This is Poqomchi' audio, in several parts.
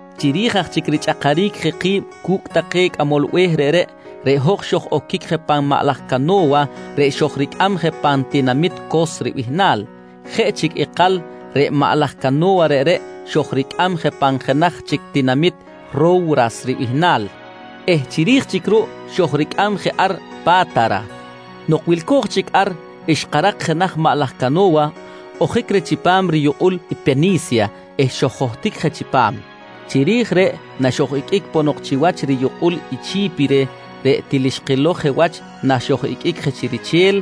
Chiri̱j aj chic richꞌakaric je ki̱b cu̱cꞌ take cꞌamol be̱h reꞌreꞌ, reꞌ hoj xoj-oquic je pan jenaj maꞌ laj cano̱wa reꞌ xojricꞌam je pan tinamit Cos ribihnal. Jeꞌ chic ikal reꞌ maꞌ laj cano̱wa reꞌreꞌ xojricꞌam je pan jenaj chic tinamit Ro̱wras ribihnal eh chiri̱j chic ruꞌ xojricꞌam je ar Pa̱tara. Nok wilco̱j chic ar, xkarak jenaj maꞌ laj cano̱wa ojic reh chipam riyukꞌul i Peni̱sya eh xoj-johtic je chipam. Chiri̱j reꞌ naxoj-iqꞌuic ponok chiwach riyukꞌul Chi̱pire reꞌ til xkilow je wach naxoj-iqꞌuic je chi riche̱l,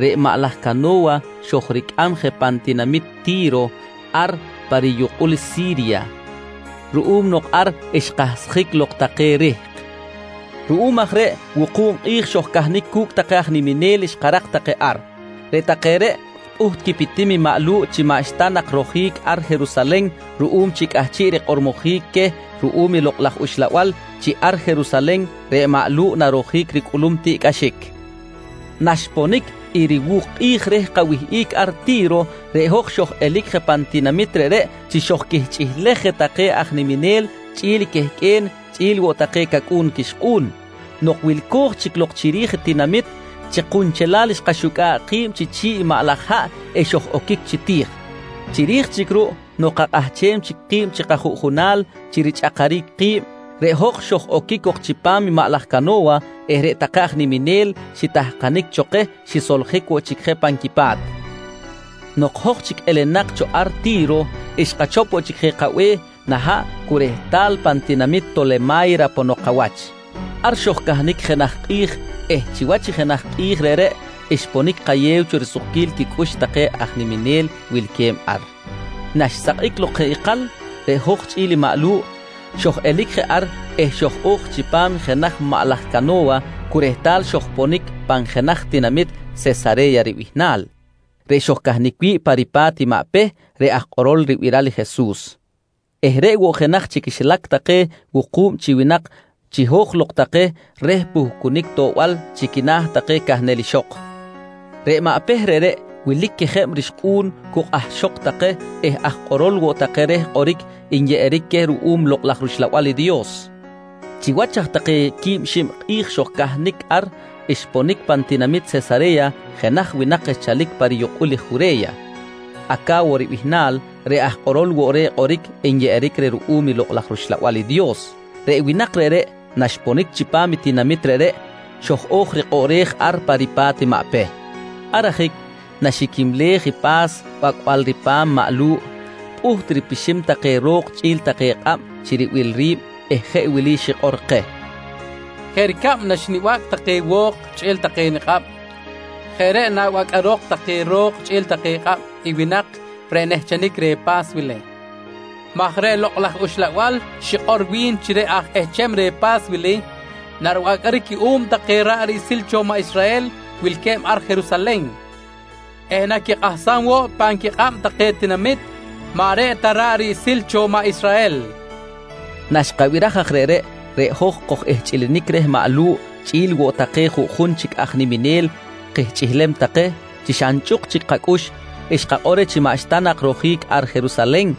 reꞌ maꞌ laj cano̱wa xojricꞌam je pan tinamit Ti̱ro ar pa riyukꞌul Si̱rya ruꞌum nok ar xkahsjic lok take rihk. Ruꞌum aj reꞌ wuku̱b kꞌi̱j xojcahnic cu̱cꞌ take aj niminel xkarak take ar. Reꞌ take reꞌ pꞌuht quipitim i maꞌ Lu̱ꞌ chi maꞌxta nak rojic ar Jerusalen ruꞌum chi cꞌahchiꞌ rikꞌormojic queh ruꞌum i Lokꞌ laj Uxlabal chi ar Jerusalen reꞌ maꞌ Lu̱ꞌ narojic ricꞌulum tiꞌcꞌaxic. Naxponic i riwu̱k kꞌi̱j reh kawihꞌic ar Ti̱ro, reꞌ hoj xoj-elic je pan tinamit reꞌreꞌ chi xojquihchꞌilej je take aj niminel chꞌi̱l quehqꞌue̱n chꞌi̱l woꞌ take cacꞌu̱n quixkꞌu̱n. Nok wilco̱j chic lok chiri̱j i tinamit, chi kunchelal xkaxucꞌa̱ꞌ ki̱b chi chi̱ꞌ i maꞌ laj haꞌ eh xoj-oquic chi ti̱j. Chiri̱j chic ruꞌ nok kakꞌahchem chic ki̱b chi kajuꞌjunal chi richꞌakaric ki̱b, reꞌ hoj xoj-oquic cok chipam maꞌ laj cano̱wa eh reꞌ take aj niminel xitahkanic cho keh xisoljic woꞌ chic je pan quipa̱t. Nok hoj chic elenak cho ar Ti̱ro, xkachop woꞌ chic je kabe̱h nah haꞌ cu rehtal pan tinamit Tolema̱yra ponok kawach. Ar xojcahnic jenaj kꞌi̱j eh chiwach i jenaj kꞌi̱j reꞌreꞌ xponic kayew cho risukquil quicꞌux take aj niminel wilque̱b ar. Naxsakꞌic lok jeꞌ ikal, reꞌ hoj chꞌi̱l i maꞌ Lu̱ꞌ xoj-elic je ar eh xoj-o̱j chipam jenaj maꞌ laj cano̱wa cu rehtal xojponic pan jenaj tinamit Sesare̱ya ribihnal reꞌ xojcahnic wi̱ꞌ pa ripa̱t maꞌ Peh reꞌ aj kꞌorol ribiral i Jesus eh reꞌ woꞌ jenaj chi quixilac take wuku̱b chi winak chiho̱j lok take reh puhcunic toꞌbal chi quina̱ take cahnel ixok. Reꞌ maꞌ Peh reꞌreꞌ wilic quejeb rixkꞌu̱n cu kꞌahxok take eh aj kꞌorol woꞌ take reh kꞌoric nyeꞌeric queh ruꞌum Lokꞌ laj rUxlabal i Dios. Chiwach aj take quib xib kꞌi̱j xojcahnic ar, xponic pan tinamit Sesare̱ya jenaj winak xchalic pa riyukꞌul Jure̱ya, Aca̱wo ribihnal reꞌ aj kꞌorol woꞌ reh kꞌoric nyeꞌeric reh ruꞌum Lokꞌ laj rUxlabal i Dios. Reꞌ winak reꞌreꞌ naxponic chipam i tinamit reꞌreꞌ, xoj-o̱j rikꞌoꞌrej ar pa ripa̱t i maꞌ Peh. Ar ajic naxiquimlej i pa̱s bacꞌbal ripa̱m maꞌ Lu̱ꞌ pꞌuht ripixim take ro̱k chꞌi̱l take kꞌab chi ribil ri̱b eh jeꞌ wili xikꞌor keh: «Jeꞌ ricab naxnibacꞌ take wo̱k chꞌi̱l take nikꞌab, jeꞌ reꞌ nabacꞌarok take ro̱k chꞌi̱l take kꞌab i winak reꞌ nehchenic reh pa̱s wili maj reꞌ Lokꞌ laj Uxlabal xikꞌor wi̱n chi reꞌ aj ehcham reh pa̱s wili naribacꞌaric cuꞌum take ra̱ꞌ riꞌsil cho maꞌ Israhel wilque̱b ar Jerusalen eh naquikꞌahsam woꞌ pan quikꞌab take tinamit maꞌ reꞌ ta ra̱ꞌ riꞌsil cho maꞌ Israhel, nqui keh. Naxkabiraj aj reꞌreꞌ, reꞌ hoj koj-ihchꞌilinic reh maꞌ Lu̱ꞌ chꞌi̱l woꞌ take juꞌjun chic aj niminel kihchꞌilem take, chi xa nchꞌuk chic kacꞌux xkakꞌor reh chi maꞌxta nak rojic ar Jerusalen,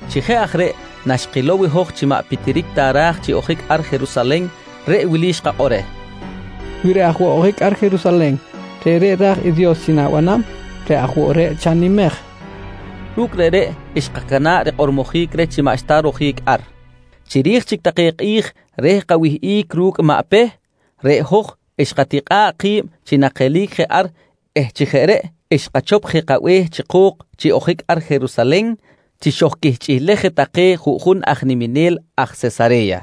Chi jeꞌ aj reꞌ naxkilow i hoj chi maꞌ pitiric ta ra̱j chi ojic ar Jerusalen, reꞌ wili xkakꞌor reh: «Wi reꞌ aj woꞌ ojic ar Jerusalen, reꞌreꞌ ra̱j i Dios chi na̱banam, reꞌ aj woꞌ reꞌ chanimej, kojqui reh. Ru̱cꞌ reꞌreꞌ xkacana̱ꞌ rikꞌormojic reh chi maꞌxta rojic ar. Chiri̱j chic take kꞌi̱j reh kawihꞌic ru̱cꞌ maꞌ Peh, reꞌ hoj xkatikꞌa̱ꞌ ki̱b chi nakelic je ar eh chi jeꞌ reꞌ xkachop je kabe̱h chi ko̱k chi ojic ar Jerusalen chi xojquihchꞌilej je take juꞌjun aj niminel aj Sesare̱ya.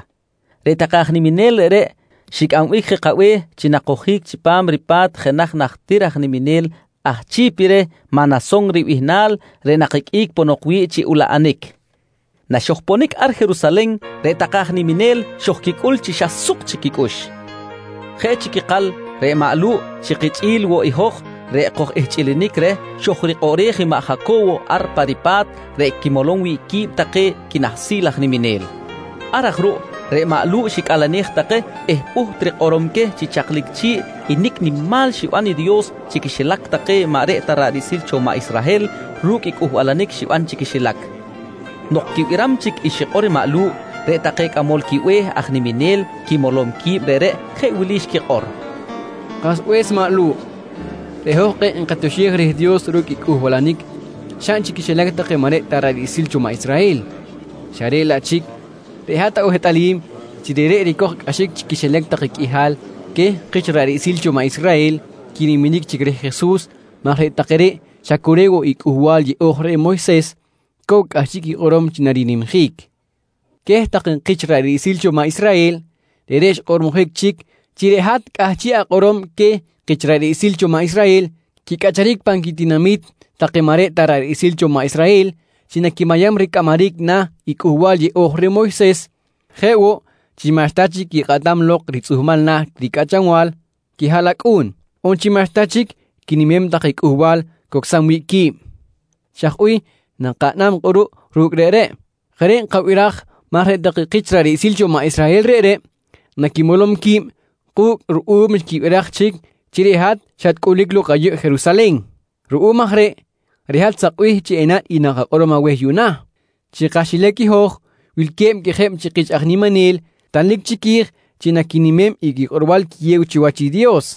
Reꞌ take aj niminel reꞌreꞌ xicꞌambic je kabe̱h chi nakojic chipam ripa̱t jenaj najtir aj niminel aj Chi̱pire Manason ribihnal reꞌ nakiqꞌuic ponok wi̱ꞌ chi ulaꞌanic. Naxojponic ar Jerusalen reꞌ take aj niminel xojquicꞌul chi xa suk chic quicꞌux. Jeꞌ chic ikal reꞌ maꞌ Lu̱ꞌ chi kichꞌi̱l woꞌ i hoj reꞌ koj-ihchꞌilinic reh, xo̱j rikꞌoꞌrej i maꞌ Jaco̱wo ar pa ripa̱t reꞌ quimolom wi̱ꞌ qui̱b take quinahsil aj niminel. Ar aj ruꞌ reꞌ maꞌ Lu̱ꞌ xicꞌalenej take eh pꞌuht rikꞌorom queh chi chaklic chi̱ꞌ i nicꞌ paꞌ nimal xiban i Dios chi quixilac take maꞌ reꞌ ta ra̱ꞌ riꞌsil cho maꞌ Israhel ru̱cꞌ i cꞌuhbalanic xiban chi quixilac. Nok quibiram chic i xikꞌor maꞌ Lu̱ꞌ, reꞌ take cꞌamol quibe̱h aj niminel quimolom qui̱b reꞌreꞌ jeꞌ wili xquikꞌor: «Kasbe̱s maꞌ Lu̱ꞌ, reꞌ hoj kꞌe̱ꞌ nkatioxej reh Dios ru̱cꞌ i cꞌuhbalanic xaꞌn chi quixilac take maꞌ reꞌ ta ra̱ꞌ riꞌsil cho maꞌ Israhel, xa reꞌ laꞌ chic reꞌ hat awehtꞌalim chi reꞌreꞌ ricoj cꞌaxic chi quixilac take qꞌuihal queh kich ra̱ꞌ riꞌsil cho maꞌ Israhel quiniminic chic reh Jesus maj reꞌ take reꞌ xa cu reꞌ woꞌ i Cꞌuhbal Yeꞌo̱j reh Moyses cow cꞌahchiꞌ quikꞌorom chi narinimjic. Queh take kich ra̱ꞌ riꞌsil cho maꞌ Israhel, reꞌreꞌ xkꞌormojic chic chi reꞌ hat cꞌahchiꞌ akꞌorom queh kich ra̱ꞌ riꞌsil cho maꞌ Israhel quicꞌacharic pan quitinami̱t take maꞌ reꞌ ta ra̱ꞌ riꞌsil cho maꞌ Israhel chi naquimayam ricꞌamaric na̱ i Cꞌuhbal Yeꞌo̱j reh Moyses, jeꞌ woꞌ chi maꞌxta chic quikꞌatam lok ritzꞌuhmal na̱ ricꞌachanbal quihaꞌlacꞌu̱n, on chi maꞌxta chic quinimem take cꞌuhbal cocsam wi̱ꞌ qui̱b. Chaj bih nakaꞌnam kꞌuruꞌ ru̱cꞌ reꞌreꞌ? Jeꞌ reꞌ nkabiraj maj reꞌ take kich ra̱ꞌ riꞌsil cho maꞌ Israhel reꞌreꞌ naquimolom qui̱b ku̱cꞌ ruꞌum xquibiraj chic chi reꞌ hat xatcꞌulic lok ayuꞌ Jerusalen. Ruꞌum aj reꞌ, reꞌ hat sakbih chi enaꞌn i nakakꞌorom aweh yuꞌna: Chi kaxilac i hoj wilque̱b quejeb chi kich aj niminel tanlic chiqui̱j chi naquinimem i quikꞌorbal quiyew chiwach i Dios.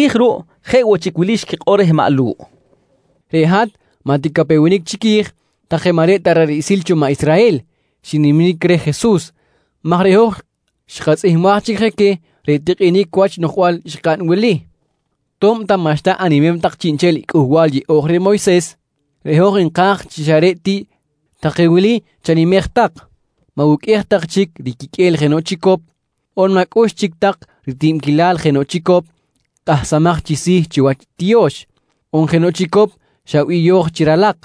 Chiri̱j ruꞌ jeꞌ woꞌ chic wili xquikꞌor reh maꞌ Lu̱ꞌ: «Reꞌ hat maꞌ ticapewenic chiqui̱j take maꞌ reꞌ ta ra̱ꞌ riꞌsil cho maꞌ Israhel xiniminic reh Jesus maj reꞌ hoj xkatzꞌihmbaj chic je queh reꞌ tikꞌinic wach noꞌjbal xkaꞌn wili: ‹To̱b ta maꞌxta animem tak chiꞌnchel i Cꞌuhbal Yeꞌo̱j reh Moyses, reꞌ hoj nka̱j chi xa reꞌ ti take wili chanimej tak: Ma̱wuqꞌuej tak chic riquiqꞌue̱l jenoꞌ chicop, on ma̱cꞌux chic tak ritibquilal jenoꞌ chicop kꞌahsamaj chi si̱ chiwach tiyo̱x, on jenoꞌ chicop xa biyo̱j chi ralak.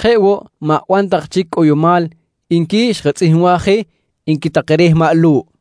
Jeꞌ woꞌ, ma̱ban tak chic cꞌoyomal, nqui xkatzꞌihmbaj je, nqui take reh maꞌ Lu̱ꞌ.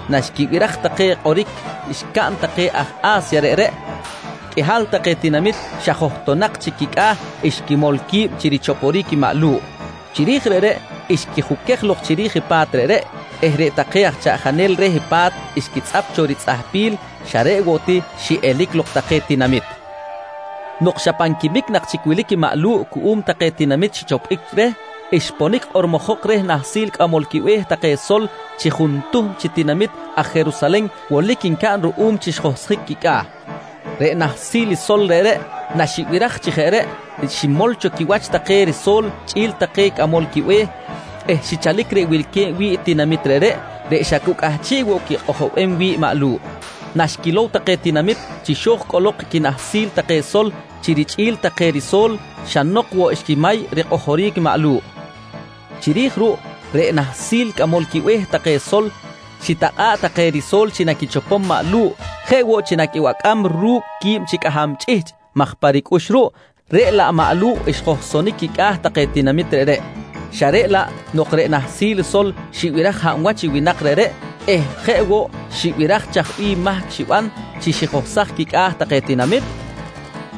Naxquibiraj take kꞌoric xcaꞌn take aj A̱sya reꞌreꞌ, qꞌuihal take tinamit xa johtonak chic quicꞌa̱ xquimol qui̱b chi richoporic maꞌ Lu̱ꞌ. Chiri̱j reꞌreꞌ xquijuquej lok chiri̱j i pa̱t reꞌreꞌ eh reꞌ take aj chaꞌjanel reh pa̱t xquitzꞌap cho ritzꞌahpil xa reꞌ woꞌ ti xiꞌelic lok take tinamit. Nok xa pan quimic nak chic wilic maꞌ Lu̱ꞌ cuꞌum take tinamit xichopbic reh, xponic kꞌormojok reh nahsil cꞌamol quibe̱h take sol chi juntuhm chi tinamit aj Jerusalen wolic ncaꞌn ruꞌum chi xjohsjic quicꞌa̱. Reꞌ nahsil i sol reꞌreꞌ naxibiraj chi jeꞌ reꞌ, ximol cho quiwach take riso̱l chꞌi̱l take cꞌamol quibe̱h eh xichalic reꞌ wilque̱b wi̱ꞌ tinamit reꞌreꞌ, reꞌ xa cu cꞌahchiꞌ woꞌ quikꞌojobem i maꞌ Lu̱ꞌ. Naxquilow take tinamit chi xo̱j cꞌolok i quinahsil take sol chi richꞌi̱l take riso̱l, xa nok woꞌ xquimay rikꞌojoric maꞌ Lu̱ꞌ. Chiri̱j ruꞌ, reꞌ nahsil cꞌamol quibe̱h take sol xitakꞌa̱ꞌ take riso̱l chi naquichopom maꞌ Lu̱ꞌ jeꞌ woꞌ chi naquibacꞌam ru̱cꞌ quib chi cꞌaham chꞌihchꞌ maj pa ricꞌux ruꞌ, reꞌ laꞌ maꞌ Lu̱ꞌ xjohsonic quicꞌa̱ take tinamit reꞌreꞌ. Xa reꞌ laꞌ, nok reꞌ nahsil sol xibiraj hab wach i winak reꞌreꞌ eh jeꞌ woꞌ xibiraj chaj bih mahc xiban chi xijohsaj quicꞌa̱ take tinamit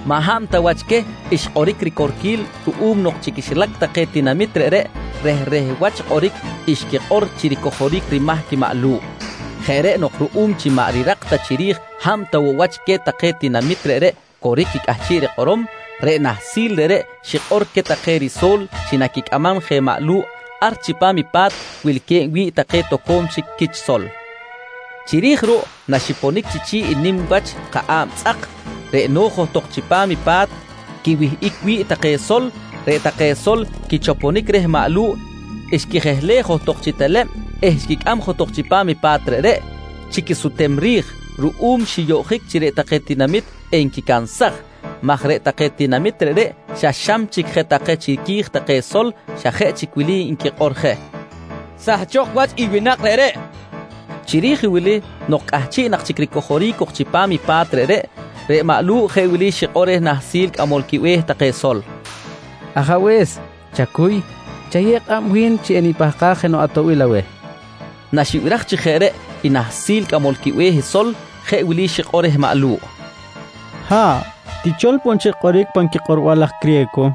maꞌ hab ta wach queh xkꞌoric ricorquil ruꞌum nok chi quixilac take tinamit reꞌreꞌ rehreh wach kꞌoric xquikꞌor chi ricojoric rimahc maꞌ Lu̱ꞌ. Jeꞌ reꞌ nok ruꞌum chi maꞌ rirak ta chiri̱j hab ta woꞌ wach queh tinamit reꞌreꞌ coric i cꞌahchiꞌ rikꞌorom, reꞌ nahsil reꞌreꞌ xikꞌor queh take riso̱l chi naquicꞌamam je maꞌ Lu̱ꞌ ar chipam i pa̱t wilque̱b wi̱ꞌ take toco̱m chic quich sol. Chiri̱j ruꞌ naxiponic chi chi̱ꞌ i nim wach kaꞌa̱b tzꞌak reꞌ no̱j johtok chipam pa̱t quiwihꞌic wi̱ꞌ take sol, reꞌ take sol quichoponic reh maꞌ Lu̱ꞌ xquijehlej johtok chi teleb eh xquicꞌam johtok chipam i pa̱t reꞌreꞌ chi quisutem ri̱j ruꞌum xiyoꞌjic chi reꞌ take tinamit enquicansaj maj reꞌ take tinamit reꞌreꞌ xa xam chic je take chiqui̱j take sol, xa jeꞌ chic wili nquikꞌor je: «Sahchok wach i winak reꞌreꞌ, nqui take. Chiri̱j wili nok cꞌahchiꞌ nak chic ricojoric cok chipam i pa̱t reꞌreꞌ, reꞌ maꞌ Lu̱ꞌ jeꞌ wili xikꞌor reh nahsil cꞌamol quibe̱h take sol: «Ajabe̱s chacuy, chayew kꞌab wi̱n chi enipahkaj jenoꞌ atoꞌbil aweh, nqui xikꞌor reh. Naxibiraj chi jeꞌ reꞌ i nahsil cꞌamol quibe̱h sol, jeꞌ wili xikꞌor reh maꞌ Lu̱ꞌ: «Ha̱ꞌ, tichol poꞌ nchel kꞌoric pan quikꞌorbal take aj criye̱co.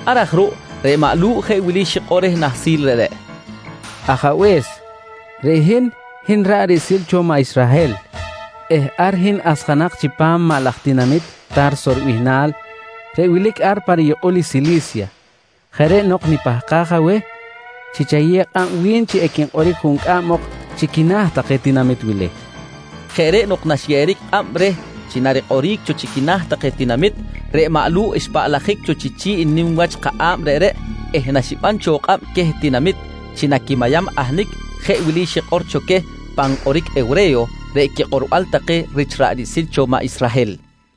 Ar aj ruꞌ reꞌ maꞌ Lu̱ꞌ jeꞌ wili xikꞌor reh nahsil reꞌreꞌ: «Ajabe̱s, reꞌ hin, hin ra̱ꞌ riꞌsil cho maꞌ Israhel eh ar hin asjanak chipam maꞌ laj tinamit Ta̱rso ribihnal reꞌ wilic ar pa riyukꞌul i Sili̱sya. Jeꞌ reꞌ nok nipahkaj aweh chi enayew kꞌab wi̱n chi equinkꞌoric juncꞌam ok chi quina̱ take tinamit wili, nqui reh. Jeꞌ reꞌ nok naxyeꞌeric kꞌab reh chi narikꞌoric chi quina̱ take tinamit, reꞌ maꞌ Lu̱ꞌ xpaꞌlajic cho chi chi̱ꞌ nim wach kaꞌa̱b reꞌreꞌ eh naxiban cho kꞌab queh tinamit chi naquimayam ahnic, jeꞌ wili xikꞌor cho queh pan kꞌoric hewre̱yo, reꞌ quikꞌorbal take rich ra̱ꞌ riꞌsil cho maꞌ Israhel: